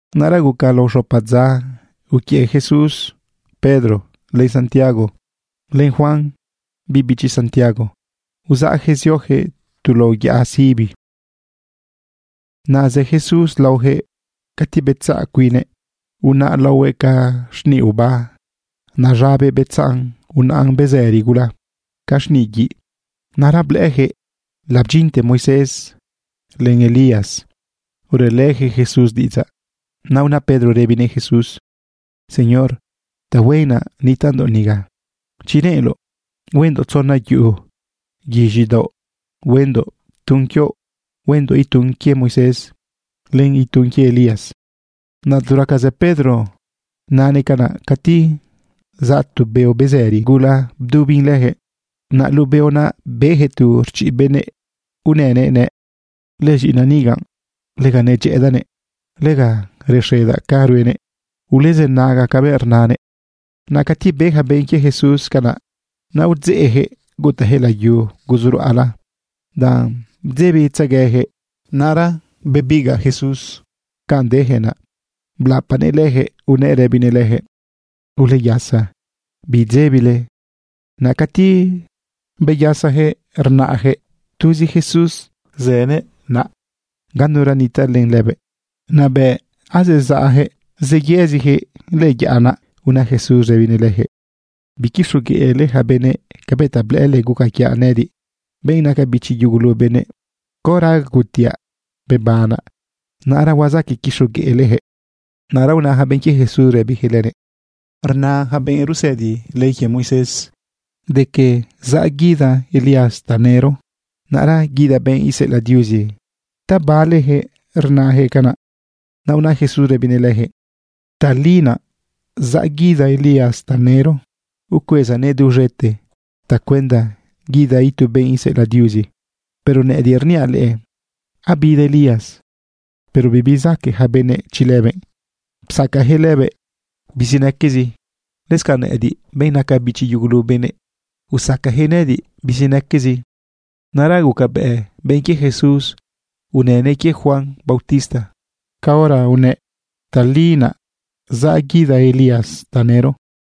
Naꞌra guca lao xopa dza, uquiëꞌ Jesús Pedro, len Santiago, len Juan biꞌ bichi Santiago, uzaꞌjëꞌ ziojëꞌ tu lao yaꞌa sibi. Naꞌ zë Jesús laojëꞌ cati betzaꞌ cuinnëꞌ, unaꞌ laohuëꞌ ca xniꞌ oba. Naꞌ z̃abëꞌ betzaꞌn unaꞌn bezëri gula ca xniꞌ guiꞌ. Naꞌra blëꞌëjëꞌ labdyinte Moisés len Elías ruꞌelëjëꞌ Jesús diꞌidzaꞌ. Naꞌ una Pedro rëbinëꞌ Jesús: ―Señor, tahuen naꞌ nitaꞌndoꞌ niga. Chi reꞌenloꞌ, huendoꞌ tzona yuꞌu guiz̃idaoꞌ. Huendoꞌ tun quioꞌ, huendoꞌ itun quie Moisés, len itun quie Elías. Naꞌ tu raca zë Pedro nanëꞌ canaꞌ, cati zaꞌ tu beo bezëri gula bdubin lëjëꞌ. Naꞌ luꞌu beo naꞌ bejëꞌ tu rchiꞌ benëꞌ unënëꞌ nëꞌ: ―Lëz̃iꞌinaꞌ niga, lega nedyëꞌëdaꞌnëꞌ. Lega rexedaꞌ ca ruenëꞌ. Ulezënaga cabëꞌ rnanëꞌ. Naꞌ cati be ja benꞌ quie Jesús canaꞌ, naꞌ udzeꞌjëꞌ gutajëꞌ layu guzu ruꞌala danꞌ bdzebitzeguejëꞌ. Naꞌra bebigaꞌ Jesús ganꞌ dejëꞌ naꞌ blapanëꞌ lëjëꞌ unëꞌ rëbinëꞌ lëjëꞌ: ―Uleyasa, bidzebile. Naꞌ cati beyasajëꞌ, rnaꞌjëꞌ tuzi Jesús zënëꞌ naꞌ. Ganura nitaꞌ len lëbëꞌ. Naꞌ bëꞌ zezaꞌjëꞌ zeyëzijëꞌ lëꞌë yaꞌa naꞌ, una Jesús rëbinëꞌ lëjëꞌ: ―Biquixogueꞌle ja benëꞌ cabëꞌ ta blëꞌële guca quiaꞌ, nëꞌëdiꞌ, benꞌ naca bichi yugulu benëꞌ. Caora agutiaꞌ bebanaꞌ, naꞌra huazaqueꞌ quixogueꞌlejëꞌ. Naꞌra una ja benꞌ quie Jesús rëbijëꞌ lënëꞌ: ―Rna yaca benꞌ rusëdi ley quie Moisés de que zaꞌ guida Elías tanëro, naꞌra guida benꞌ iseꞌelaꞌ Diuzi. ¿Ta balejëꞌ rnajëꞌ canaꞌ? Naꞌ una Jesús rëbinëꞌ lëjëꞌ: ―Tali naꞌ zaꞌ guida Elías tanëro, ucuezanëꞌ duz̃ete cuenda guida itu benꞌ iseꞌelaꞌ Diuzi. Pero nëꞌëdiꞌ rniaꞌ leꞌe, abida Elías, pero bibezaque ja benëꞌ chi lëbëꞌ. Psacajëꞌ lëbëꞌ bizinaquezi. Lëscanꞌ nëꞌëdiꞌ, benꞌ naca bichi yugulu benëꞌ, usacajëꞌ nëꞌëdiꞌ bizinaquezi. Naꞌra gucabëꞌ benꞌ quie Jesús unënëꞌ quie Juan bautista caora unëꞌ: “Tali naꞌ zaꞌ guida Elías tanëro.”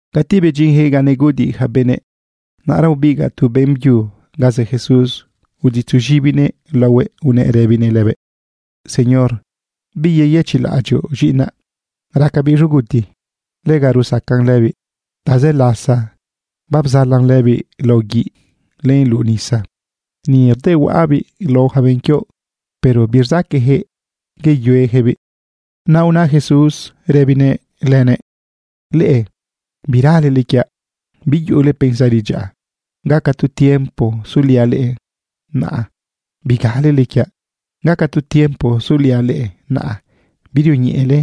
Cati bedyinjëꞌ ga neguꞌudiꞌ ja benëꞌ, naꞌra ubigaꞌ tu beꞌmbyu ganꞌ zë Jesús uditzunëꞌ z̃ibinëꞌ laohuëꞌ unëꞌ rëbinëꞌ lëbëꞌ: ―Señor, ¿biyeyëchiꞌlaꞌadyoꞌ z̃iꞌinaꞌ? Racabiꞌ z̃uguti. Lega rusacan lëbiꞌ. Tazë lasa babzalan lëbiꞌ lao guiꞌ len luꞌu nisa. Ni rdehuaꞌabiꞌ lao ja benꞌ quioꞌ, pero birzaqueꞌjëꞌ yeyuejëꞌbiꞌ. Naꞌ una Jesús rëbinëꞌ benꞌ zu naꞌ: ―Leꞌe biralele quiaꞌ. Biyuꞌule pensari dyaꞌa. ¿Gaca tu tiempo suliaꞌ leꞌe, naꞌ bigalele quiaꞌ? ¿Gaca tu tiempo suliaꞌ leꞌe, naꞌ birioñeꞌele?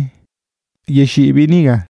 Yexiꞌbiꞌ niga.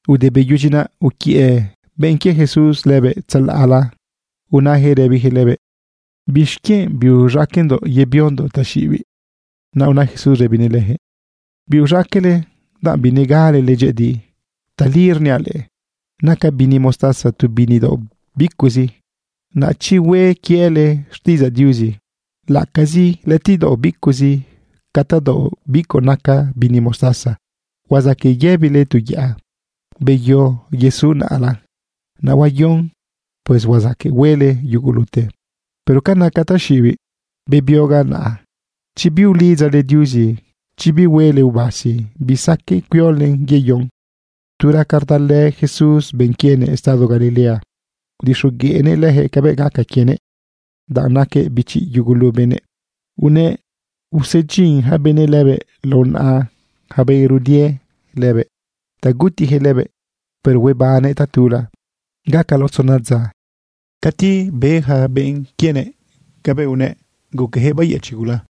Ude beyudyi naꞌ, uquiëꞌ benꞌ quie Jesús lëbëꞌ tzalaꞌla unajëꞌ rëbijëꞌ lëbëꞌ: ―¿Bixquienꞌ biuz̃aqueꞌndoꞌ yebiondoꞌ taxiꞌibiꞌ? Naꞌ una Jesús rëbinëꞌ lëjëꞌ: ―Biuz̃aqueꞌle danꞌ binegalele dyëꞌëdi. Tali rniaꞌ leꞌe, naca bini mostaza tu bini daoꞌ bicuꞌzi. Naꞌ chi hue quiele xtiꞌidzaꞌ Diuzi laꞌacazi lëꞌëtiꞌdaoꞌ bicuꞌzi ca tadaoꞌ bicuꞌ naca bini mostaza, huazaqueꞌ yëbile tu yaꞌa: “Beyo yesu naꞌla”, naꞌ huayon. Pues huazaqueꞌ huele yugulute. Pero ca naca taxiꞌibiꞌ bebiogaꞌ naꞌa, chi biulidzale Diuzi, chi bihuele ubasi, bisaqueꞌ cuiolen yeyon. Tu raca rdalë Jesús benꞌ quienëꞌ estado Galilea, udixogueꞌnëꞌ lëjëꞌ cabëꞌ gaca quienëꞌ danꞌ naquëꞌ bichi yugulu benëꞌ. Unëꞌ usedyin ja benëꞌ lëbëꞌ lao naꞌa ja benꞌ rudie lëbëꞌ ta gutijëꞌ lëbëꞌ, pero huebannëꞌ tatula gaca lao tzona dza. Cati be yaca benꞌ quienëꞌ cabëꞌ unëꞌ, guqueꞌjëꞌ bayëchiꞌ gula.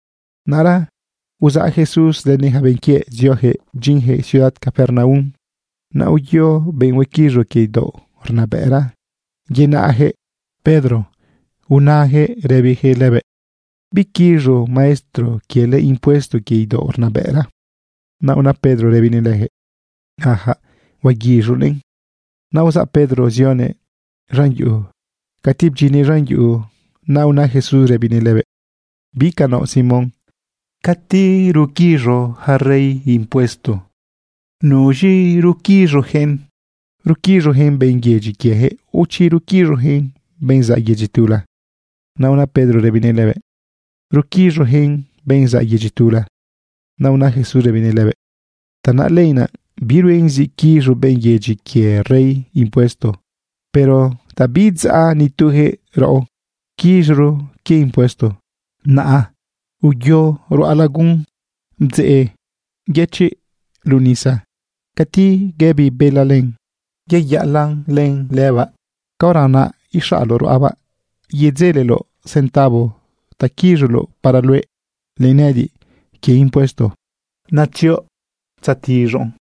Naꞌra uzaꞌ Jesús lënëꞌ ja benꞌ quiëꞌ ziojëꞌ bdyinjëꞌ ciudad Capernaum. Naꞌ uyo benꞌ huequiz̃u quie idaoꞌ rnabëꞌra yenaꞌjëꞌ Pedro unajëꞌ rëbijëꞌ lëbëꞌ: ―¿Biquiz̃u maestro quiele impuesto quie idaoꞌ rnabëꞌra? Naꞌ una Pedro rëbinëꞌ lëjëꞌ: ―Ajaꞌ, huaguiz̃unëꞌn. Naꞌ uzaꞌ Pedro zionëꞌ z̃an yuꞌu. Cati bdyinnëꞌ z̃an yuꞌu, naꞌ una Jesús rëbinëꞌ lëbëꞌ: ―¿Bi ca inaoꞌ, Simón? ¿Cati ruquiz̃u ja rey impuesto, nuz̃i ruquiz̃ujëꞌ? ¿Ruquiz̃ujëꞌ benꞌ yedyi quiejëꞌ o chi ruquiz̃ojëꞌ benꞌ zaꞌ yedyi tula? Naꞌ una Pedro rëbinëꞌ lëbëꞌ: ―Ruquiz̃ujëꞌ benꞌ zaꞌ yedyi tula. Naꞌ una Jesús rëbinëꞌ lëbëꞌ: ―Tanaꞌ lenaꞌ biruen zi quiz̃u benꞌ yedyi quie rey impuesto. Pero ta biidzaꞌ nitujëꞌ raꞌo, quiz̃oro quie impuesto. Naꞌ uyo ruꞌa lagun, bdzeꞌ yëchiꞌ luꞌu nisa. Cati guëbi bela len, yeyaꞌalaꞌn len lëbaꞌ, caora naꞌ ixaꞌloꞌ ruꞌabaꞌ yedzeleloꞌ centavo ta quiz̃uloꞌ para luëꞌ len nëꞌëdiꞌ quie impuesto. Naꞌ uyo yetiz̃oꞌn naꞌa.